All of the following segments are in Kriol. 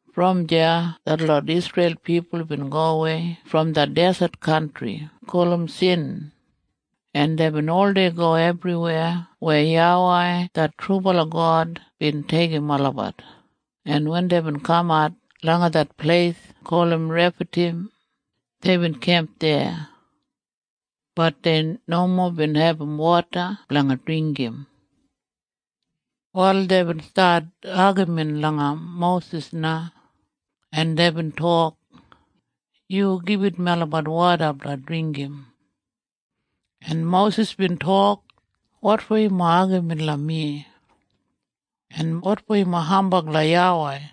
Brom deya detlot Isreil pipul bin gowei brom det deset kantri gulum Sin, en deibin oldei go ebriweya weya YAWEI det trubala God bin deigim olabat, en wen deibin kamat langa det pleis gulum Refadim, deibin kemp deya. Bat dei nomo bin abum woda blanga dringgim. Wal deibin stat agamin langa Mosis na, en deibin tok, “Yu gibit melabat woda blanga dringgim!” En Mosis bin tok, “Wotfo yumob agamin langa mi? En wotfo yumob hambag langa YAWEI?”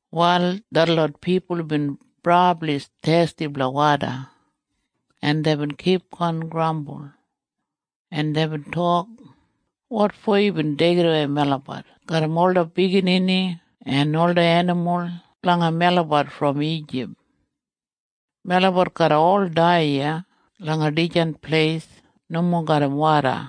Wal detlot pipul bin brabli thesti blanga woda, en deibin kipgon grambul, en deibin tok, “Wotfo yubin deigidawei melabat garram ola biginini en ola enimul blanga melabat brom Ijip? Melabat garra ol dai iya langa dijan pleis nomo garram woda.”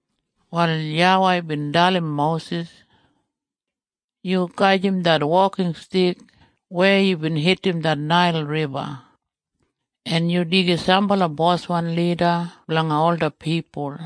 Wal YAWEI bin dalim Mosis, “Yu gajim det wokinstik weya yubin hitim det Nail Riba, en yu deigim sambala boswan lida blanga ola pipul,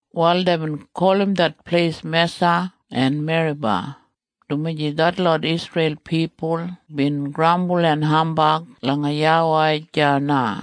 Wal deibin gulum det pleis Mesa en Meriba, dumaji detlot Isreil pipul bin grambul en hambag langa YAWEI deya na.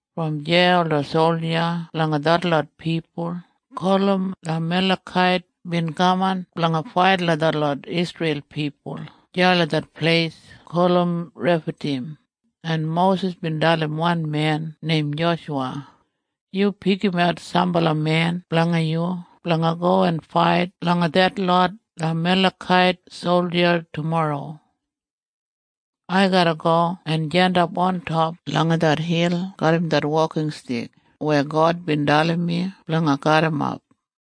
Brom deya ola solja blanga detlot pipul gulum Amalekait bin kaman blanga fait langa detlot Isreil pipul deya langa det pleis gulum Refadim, en Mosis bin dalim wan men neim Joshuwa, “Yu pikimat sambala men blanga yu blanga go en fait langa detlot Amalekait solja tumorro. Ai garra go en jandap ontop langa det hil garram det wokinstik weya God bin dalim mi blanga garrimap.”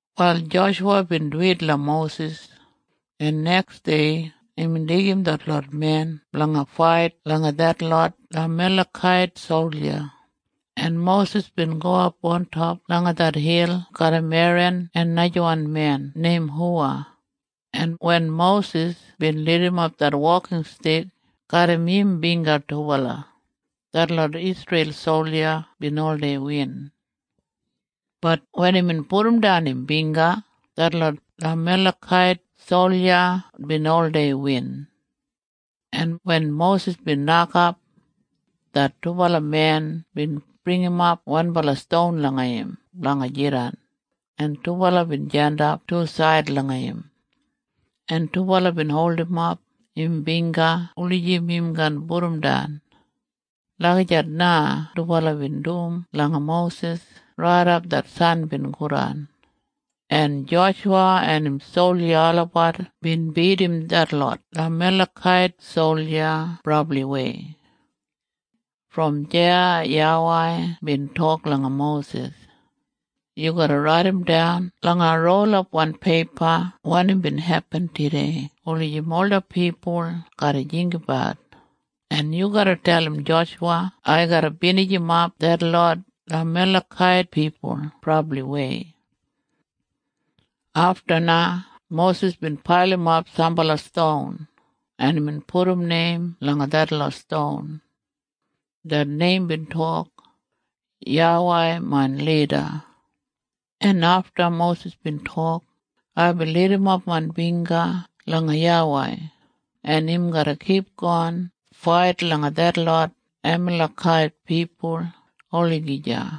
Wal Joshuwa bin duwit langa Mosis, en neksdei imbin deigim detlot men blanga fait langa detlot Amalekait solja, en Mosis bin gowap ontop langa det hil garram Eran en najawan men neim Huwa, en wen Mosis bin lidimap det wokinstik garram im bingga dubala, detlot Isreil solja bin oldei win. Bat wen imbin pudumdan im bingga, detlot Amalekait solja bin oldei win. En wen Mosis bin nokap, det dubala men bin bringimap wanbala ston langa im blanga jidan, en dubala bin jandap tusaid langa im, en dubala bin holdimap im bingga wulijim im kaan pudumdan. Lagijat na dubala bin dum langa Mosis raidap det san bin godan, en Joshuwa en im solja olabat bin bidim detlot Amalekait solja brabliwei. Brom deya YAWEI bin tok langa Mosis, “Yu garra raidimdan langa rolapwan peipa wanim bin hepin tudei wulijim ola pipul garra jinggabat, en yu garra dalim Joshuwa ai garra binijimap detlot Amalekait pipul brabliwei.” Afta na Mosis bin pailimap sambala ston, en imbin pudum neim langa detlot ston. Det neim bin tok, “YAWEI main Lida.” En afta Mosis bin tok, “Aibin lidimap main bingga langa YAWEI, en im garra kipgon fait langa detlot Amalekait pipul olagija.”